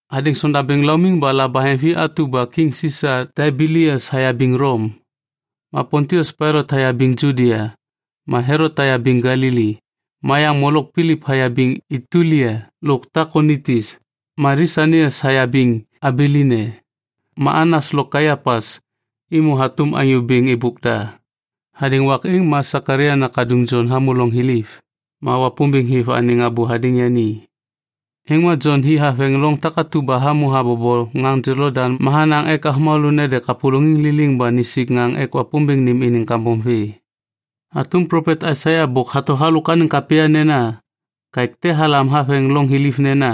Hadêŋ sondabêŋ laumiŋ ba labaheŋvi atu ba kiŋ Sisa Taibelias hayabiŋ Lom, ma Pontius Pailat hayabiŋ Judia, ma Helot hayabiŋ Galili, ma yaŋ molok Pilip hayabiŋ Itulia lo Takonitis, ma Lisanias hayabiŋ Abilene, ma Anas lo Kaiapas êmô hatôm anyô bêŋ êbôk da. Hadêŋ wak êŋ ma Sekalaia nakaduŋ Jon hamô loŋ thiliv, ma Wapômbêŋ hêv anêŋ abô hadêŋ yani. Êŋ ma Jon hi haveŋ loŋ takatu ba hamô habobo ŋaŋ Jolodaŋ ma hanaŋ ek avômalô nede kapôlôŋiŋ liliŋ ba nisik ŋaŋ ek Wapômbêŋ nêm iniŋ kambom vê. Hatôm plopet Aisaia bôk hato halôk anêŋ kapya nena, “Kaêk te halam haveŋ loŋ thiliv nena,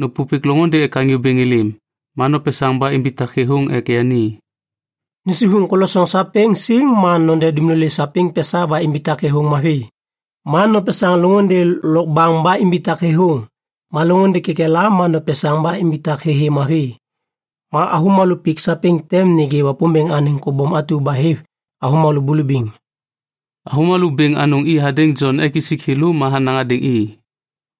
‘Nôpôpêk loŋôndê ek Anyô Bêŋ êlêm, ma nopesaŋ ba imbitak thêthôŋ ek yani. Nusivuŋ kolosoŋ sapêŋ siŋ ma node dumlolê sapêŋ pesa ba imbitak kalôŋ mavi. Ma nopesaŋ loŋôndê lokbaŋ ba imbitak thêthôŋ, ma loŋôndê kekela ma nopesaŋ ba imbitak thêthê mavi. Ma avômalô pik sapêŋ tem nêgê Wapômbêŋ anêŋ kobom atu ba hêv avômalô bulubiŋ.’” Avômalô bêŋ anôŋ i hadêŋ Jon ek isik thêlô ma hanaŋ hadêŋ i,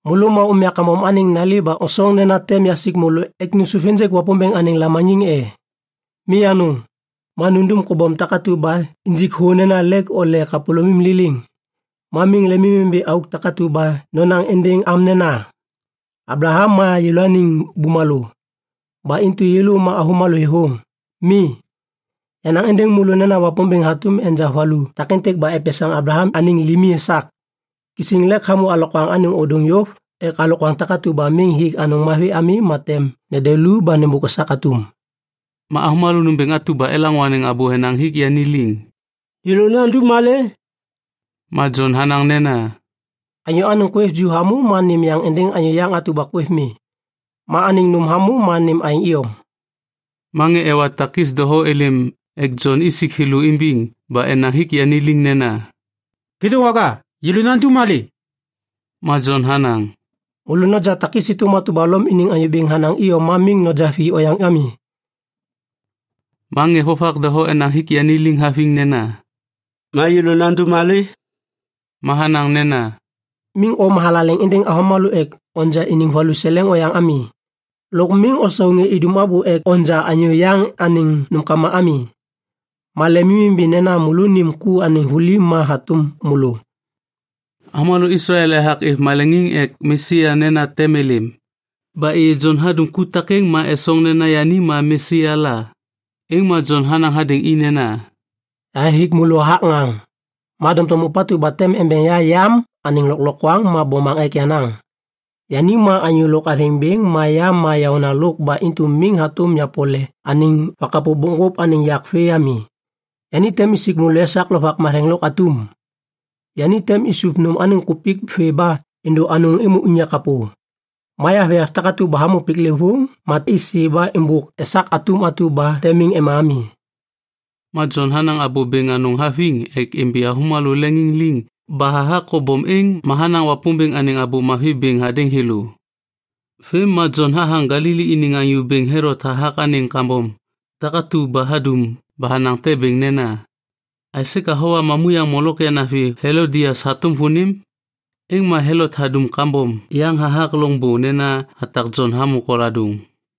“Môlô ma umya kambom anêŋ nali ba osoŋ nena tem yasik môlô ek nôsôv ênjêk Wapômbêŋ anêŋ lamaniŋ e? Mi anôŋ! Ma nundum kobom takatu ba injik thô nena lêk ole kapôlômim liliŋ. Ma miŋ lemimimbi auk takatu ba nonaŋ êndêŋ am nena, ‘Ablaham ma yêlôaniŋ bumalô. Ba intu yêlô ma avômalô thêthôŋ.’ Mi, yanaŋ êndêŋ môlô nena Wapômbêŋ hatôm enja valu takêntêk ba epesaŋ Ablaham anêŋ limi esak. Kisiŋ lêk hamô alokwaŋ ôdôŋ yôv ek alokwaŋ takatu ba miŋ hik anôŋ mavi ami ma tem nede lu ba nêmbôk esak atum.” Ma avômalô nômbêŋ atu ba elaŋô anêŋ abô enaŋ hik yani liŋ, “Yêlô nandum malê?” Ma Jon hanaŋ nena, “Anyô anêŋ kwêv ju hamô ma nêm yaŋ êndêŋ anyô yaŋ atu ba kwêv mi. Ma anêŋ nôm hamô ma nêm aêŋ iyom.” Ma ŋê ewa takis doho êlêm ek Jon isik thêlô imbiŋ ba enaŋ hik yani liŋ nena, “Kêdôŋwaga, yêlô nandum malê?” Ma Jon hanaŋ, “Môlô noja takis êtôm atu ba Lom iniŋ anyô bêŋ hanaŋ iyom ma miŋ noja vi oyaŋ ami.” Ma ŋê vovak doho enaŋ hik yani liŋ haviŋ nena, “Ma yêlô nandum malê?” Ma hanaŋ nena, “Miŋ o mathalaleŋ êndêŋ avômalô ek noja iniŋ valuseleŋ oyaŋ ami. Lôk miŋ osau ŋê idum abô ek onja anyô yaŋ anêŋ nômkama ami. Ma lemimimbi nena môlônim ku anêŋ vuli ma hatôm môlô.” Avômalô Islael ethak êv maleŋiŋ ek Mesia nena tem êlêm. Ba êyê Jon hadum ku takêŋ ma esoŋ nena yani ma Mesia la. Êŋ ma Jon hanaŋ hadêŋ i nena, “Yahathik môlô hathak ŋaŋ, ma doŋtom ôpatu ba tem embeŋ ya yam anêŋ lôklokwaŋ ma bomaŋ ek yenaŋ. Yani ma anyô lôk athêŋ bêŋ ma ya ma yaônalôk ba intu miŋ hatôm yapole anêŋ vakapô bokŋgôp anêŋ yak vê ami. Yani tem isik môlô esak Lovak Matheŋ lôk atum. Yani tem isuv nôm anêŋ kupik vê ba êndô anôŋ êmô unyak kapô. Ma yavoyav takatu ba hamô piklêvôŋ ma isi ba êmbôk esak atum atu ba tem miŋ ema ami.” Ma Jon hanaŋ abô bêŋ anôŋ haviŋ ek imbi avômalô leŋiŋ liŋ ba hathak kobom êŋ ma hanaŋ Wapômbêŋ anêŋ Abô Mavi bêŋ hadêŋ thêlô. Vêm ma Jon hathaŋ Galili iniŋ Anyô Bêŋ Helot hathak anêŋ kambom takatu ba hadum ba hanaŋ te bêŋ nena, “Aisê ka howa mamuyaŋ molok yanavi Helodias hatôm vônim?” Êŋ ma Helot hadum kambom yaŋ hathak loŋbô nena hatak Jon hamô koladôŋ.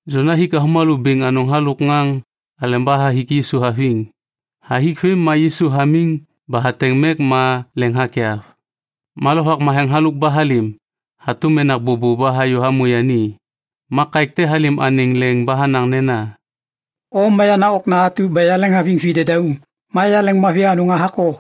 Jon hathik avômalô bêŋ anôŋ halôk ŋaŋ aleba hathik Yisu haviŋ. Hathik vêm ma Yisu hamiŋ ba hateŋ mek ma leŋ hakyav. Ma Lovak Matheŋ halôk ba halêm hatôm menak bôbô ba hayô hamô yani. Ma kaêk te halêm anêŋ leŋ ba hanaŋ nena, “O ma yenaŋ okna atu ba yaleŋhaviŋ videdauŋ. Ma yaleŋmavi anôŋ hathak o.”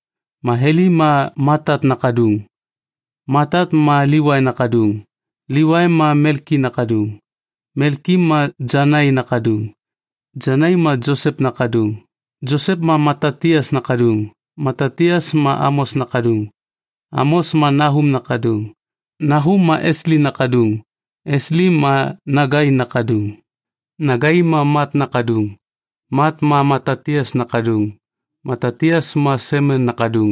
Ma Heli ma Matat nakaduŋ. Matat ma Livai nakaduŋ. Livai ma Melki nakaduŋ. Melki ma Janai nakaduŋ. Janai ma Josep nakaduŋ. Josep ma Matatias nakaduŋ. Matatias ma Amos nakaduŋ. Amos ma Nahum nakaduŋ. Nahum ma Esli nakaduŋ. Esli ma Nagai nakaduŋ. Nagai ma Mat nakaduŋ. Mat ma Matatias nakaduŋ. Matatias ma Semen nakaduŋ.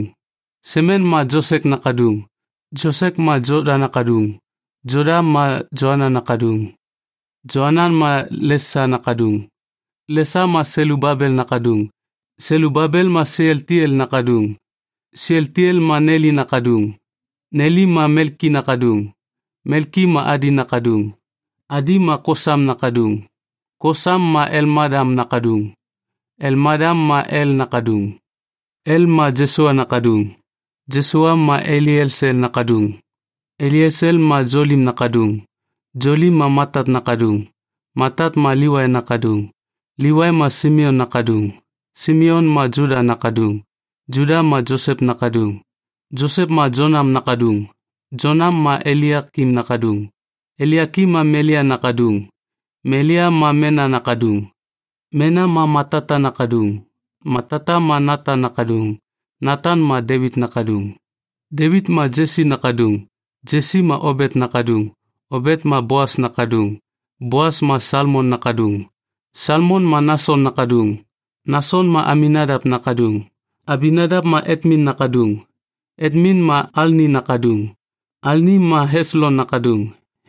Semen ma Josek nakaduŋ. Josek ma Joda nakaduŋ. Joda ma Joanan nakaduŋ. Joanan ma Lesa nakaduŋ. Lesa ma Selubabel nakaduŋ. Selubabel ma Sealtiel nakaduŋ. Sealtiel ma Neli nakaduŋ. Neli ma Melki nakaduŋ. Melki ma Adi nakaduŋ. Adi ma Kosam nakaduŋ. Kosam ma Elmadam nakaduŋ. Elmadam ma El nakaduŋ. El ma Josua nakaduŋ. Josua ma Eliesel nakaduŋ. Eliesel ma Jolim nakaduŋ. Jolim ma Matat nakaduŋ. Matat ma Livai nakaduŋ. Livai ma Simeon nakaduŋ. Simeon ma Juda nakaduŋ. Juda ma Josep nakaduŋ. Josep ma Jonam nakaduŋ. Jonam ma Eliakim nakaduŋ. Eliakim ma Melea nakaduŋ. Melea ma Mena nakaduŋ. Mena ma Matata nakaduŋ. Matata ma Natan nakaduŋ. Natan ma Devit nakaduŋ. Devit ma Jesi nakaduŋ. Jesi ma Obet nakaduŋ. Obet ma Boas nakaduŋ. Boas ma Salmon nakaduŋ. Salmon ma Nason nakaduŋ. Nason ma Aminadap nakaduŋ. Aminadap ma Atmin nakaduŋ. Atmin ma Alni nakaduŋ. Alni ma Heslon nakaduŋ.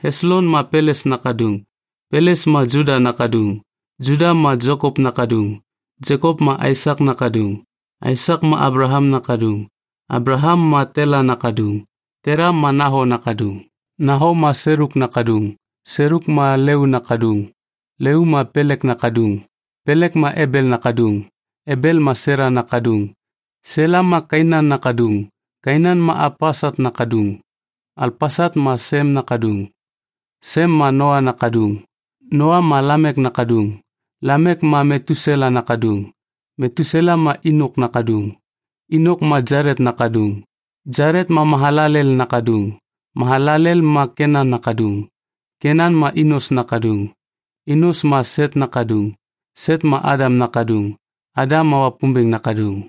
Heslon ma Peles nakaduŋ. Peles ma Juda nakaduŋ. Juda ma Jekop nakaduŋ. Jekop ma Aisak nakaduŋ. Aisak ma Ablaham nakaduŋ. Ablaham ma Tela nakaduŋ. Tela ma Naho nakaduŋ. Naho ma Seluk nakaduŋ. Seluk ma Leu nakaduŋ. Leu ma Pelek nakaduŋ. Pelek ma Ebel nakaduŋ. Ebel ma Sela nakaduŋ. Sela ma Kainan nakaduŋ. Kainan ma Alpaksat nakaduŋ. Alpaksat ma Sem nakaduŋ. Sem ma Noa nakaduŋ. Noa ma Lamek nakaduŋ. Lamek ma Metusela nakaduŋ. Metusela ma Inok nakaduŋ. Inok ma Jalet nakaduŋ. Jalet ma Mahalalel nakaduŋ. Mahalalel ma Kenan nakaduŋ. Kenan ma Inos nakaduŋ. Inos ma Set nakaduŋ. Set ma Adam nakaduŋ. Adam ma Wapômbêŋ nakaduŋ.